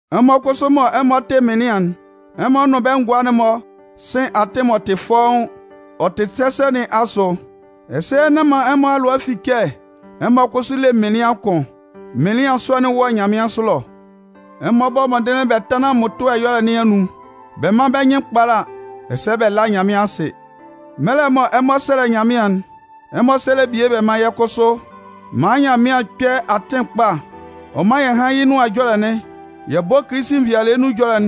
Ɛmɔ kʋsʋ mɔ ɛmɔ tɩ mɩnlɩan'n, ɛmɔ nʋn bɛ́ ngʋa'n-mɔ sɩ́n atɩn m'ɔ tɩ fɔ́ʋ́n, ɔ tɩ sɛsɛ nɩn asʋ. Ɛsɛ, nán man ɛmɔ alʋa fi kɛ ɛmɔ kʋsʋ le Mɩnlɩan kʋn. Mɩnlɩan sɔ'n wɔ nyanmɩansʋ ɛlɔ. Ɛmɔ bɔ́ mɔndɩnlɩn bɛ tánlan mmʋtʋɛ ɛyɔlɛ nɩn anun, bɛ mán bɛ́ nyɩn kpála, ɛsɛ bɛ lá Nyanmɩan asɩ. Mɛlɛ mɔ ɛmɔ 'sɛlɛ Nyanmɩan'n, ɛmɔ sɛ́lɛ bie bɛ mán yɛ́ kʋsʋ maan Nyanmɩan kpɛ́ atɩn kpa ɔ mán yɛ hán yɩ́ Nʋan Ɛjɔlɛ'n, yɛ bɔ́ Kilisi nvɩalɩɛ nun ɛjɔlɛ'n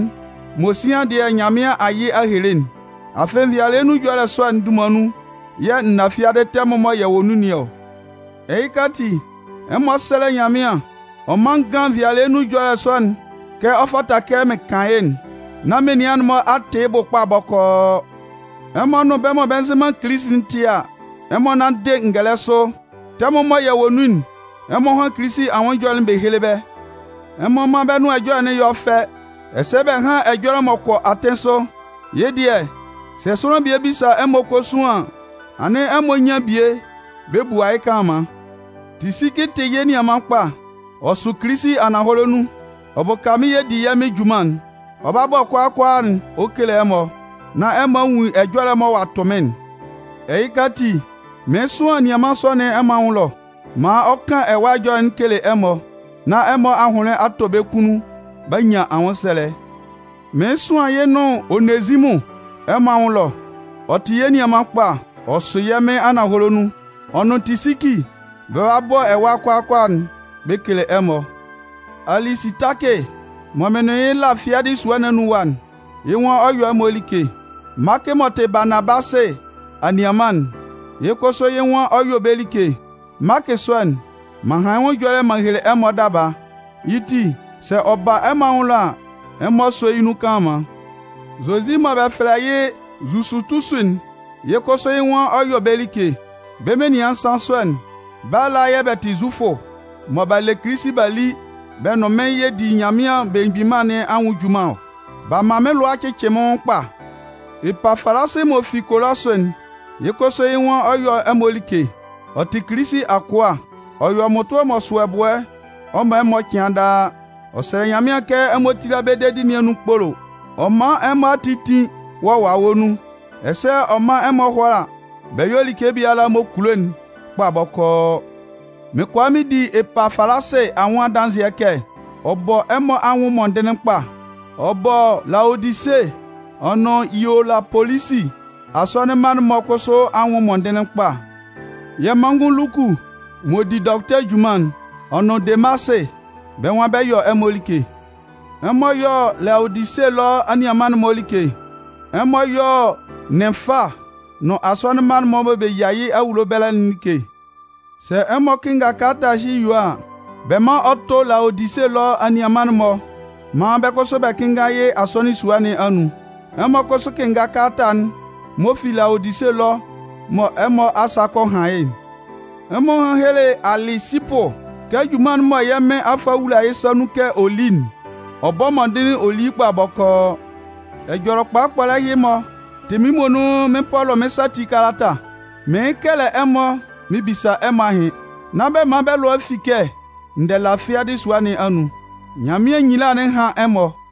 mɔ sian dɩɛ Nyanmɩan a yɩ a hele'n. Afɩ nvɩalɩɛ nun ɛjɔlɛ sɔ'n dunman nun yɛ̂ n na fiadɩ tɛmʋn mɔ yɛ wɔ nun nɩn ɔ. Ɛhɩka ati, ɛmɔ sɛ́lɛ Nyanmɩan. Ɔ mán n gán nvɩalɩɛ nun ɛjɔlɛ sɔ'n kɛ ɔ fata kɛ mɩn kan yɩ́'n, nán menian'n-mɔ a tɩ yɩ́ bʋ kpa bɔkɔɔ. Ɛmɔ nʋn bɛ́ mɔ bɛ nzɩ man Kilisi'n tɩ a, ɛmɔ nánndɩ ngɛlɛ sʋ. Tɛmʋn'n mɔ yɛ wɔ nun'n, ɛmɔ hán Kilisi anwʋn ɛjɔlɛ'n bɛ héle bɛ́. Ɛmɔ mán bɛ́ nʋan ɛjɔlɛ'n yɔ́ fɛ, ɛsɛ bɛ hán ɛjɔlɛ m'ɔ kɔ atɩn sʋ. Yɩ́ dɩɛ, sɛ sʋanlan bie bisa ɛmɔ kosuan an, anɩn ɛmɔ nyan bie bɛ bua yɩ́ kanlanman. Tisiki tɩ yɛ́ nianman kpa, ɔ sʋ Kilisi ananhɔlɛ nun, ɔ bʋka mɩ́n yɛ di yɛ́ Mɩn junman'n. Ɔ 'ba bɔ kʋalaa kʋalaa'n ɔ kele ɛmɔ, nán ɛmɔ a nwun ɛjɔlɛ'n mɔ ɔ'a tʋ mɩ́n'n. Ɛhɩka ati, mɩɩn sʋan anianman sɔ nɩn ɛmɔ anwʋn ɛlɔ, maan ɔ kan ɛwa ɛjɔlɛ ɔ kele ɛmɔ, nán ɛmɔ ahʋnlɩn a tɔ bɛ́ kunnun b'a nyan anwʋnsɛlɛ. Mɩɩn sʋan yɩ́ nʋn Onezimʋn ɛmɔ anwʋn ɛlɔ. Ɔ tɩ yɛ́ nianman kpa, ɔ sʋ yɛ́ Mɩn ananhɔlɛ nun. Ɔ nʋn Tisiki, bɛ 'ba bɔ ɛwa kʋalaa kʋalaa'n bɛ kele ɛmɔ. Alisitakɩ mɔ mɩn nʋn yɩ́ la fiadɩ sʋa nɩn anun ɛwa'n, yɩ́ nwan ɔ 'yɔ ɛmɔ like. Maakɩ m'ɔ tɩ Baanabasɩ anianman'n, yɩ́ kʋsʋ yɩ́ nwan ɔ 'yɔ bɛ́ like. Maakɩ sɔ'n, m'an han yɩ́ nwʋn ɛjɔlɛ m'an hele ɛmɔ daba. Yɩ́ ti, sɛ ɔ ba ɛmɔ anwʋn ɛlɔ a, ɛmɔ sɔ́ yɩ́ nun kanlanman. Zozi mɔ bɛ fɛlɛ yɩ́ Zusutusu'n, yɩ́ kʋsʋ yɩ́ nwan ɔ 'yɔ bɛ́ like. Bɛ́ menian nsan sɔ'n, bɛ́ ala yɛ̂ bɛ tɩ Zufʋ mɔ b'a le Kilisi b'a li bɛ nʋn mɩ́n yɛ di Nyanmɩan Belemgbin Mân nɩn anwʋn junman ɔ. B'a man mɩ́n lʋa a cɩcɩ mɩ́n nwʋn kpa. Epafalasɩ m'ɔ fi Kolɔsʋ'n, yɩ́ kʋsʋ yɩ́ nwan ɔ 'yɔ ɛmɔ like. Ɔ tɩ Kilisi akʋa. Ɔ yɔ mmʋtʋɛ m'ɔ sʋ ɛbʋɛ ɔ man ɛmɔ cɩan daa. Ɔ sɛlɛ Nyanmɩan kɛ ɛmɔ tíla bɛ́ dedi nɩn anun kpolo, ɔ mán ɛmɔ ati tín wɔ Wawɛ nun, ɛsɛ ɔ mán ɛmɔ hʋ́ala bɛ yɔ́ like biala m'ɔ kulo'n kpa bɔkɔɔ. Mɩn kʋala mɩn di Epafalasɩ anwʋn adanzɩɛ kɛ, ɔ bɔ ɛmɔ anwʋn mɔndɩnlɩn kpa. Ɔ bɔ Laodise ɔ nʋn Hielapolisi asɔnɩn mma'n-mɔ kʋsʋ anwʋn mɔndɩnlɩn kpa. Yɛ́ manngʋn Luku m'ɔ di dɔkʋtɛ junman'n, ɔ nʋn Demasɩ, bɛ́ nwan bɛ 'yɔ ɛmɔ like. Ɛmɔ yɔ́ Laodise ɛlɔ anianman'n-mɔ like. Ɛmɔ yɔ́ Nɩnfa nʋn asɔnɩn mma'n-mɔ mɔ bɛ yia yɩ́ awulo ɛbɛlɛ'n like. Sɛ ɛmɔ kɩnnga kalata ɛhɩ yue a, bɛ mán ɔ tʋ́ Laodise ɛlɔ anianman'n-mɔ maan bɛ́ kʋsʋ bɛ kɩ́nnga yɩ́ asɔnɩn sua nɩn anun. Ɛmɔ kʋsʋ kɩ́nnga kalata'n m'ɔ fi Laodise ɛlɔ mɔ ɛmɔ asa kɔ han yɩ́'n. Ɛmɔ hán héle Alɩsipʋ kɛ junman'n mɔ yɛ́ Mɩn a fa a wula yɩ́ sa nun kɛ ɔ lí'n, ɔ bɔ́ mɔndɩnlɩn ɔ lí yɩ́ kpa bɔkɔɔ. Ɛjɔlɛ kpɔlɛ ɛhɩ-mɔ tɩ mɩ́n muonun mɩ́n Pɔlʋ mɩ́n sa ati kalata. Mɩɩn kɛlɛ ɛmɔ mɩn bisa bɛ́ ahɩn. Nán bɛ man bɛ́ lʋa fi kɛ n dɛ la fiadɩ sua nɩn anun. Nyanmɩan nyila'n hán ɛmɔ!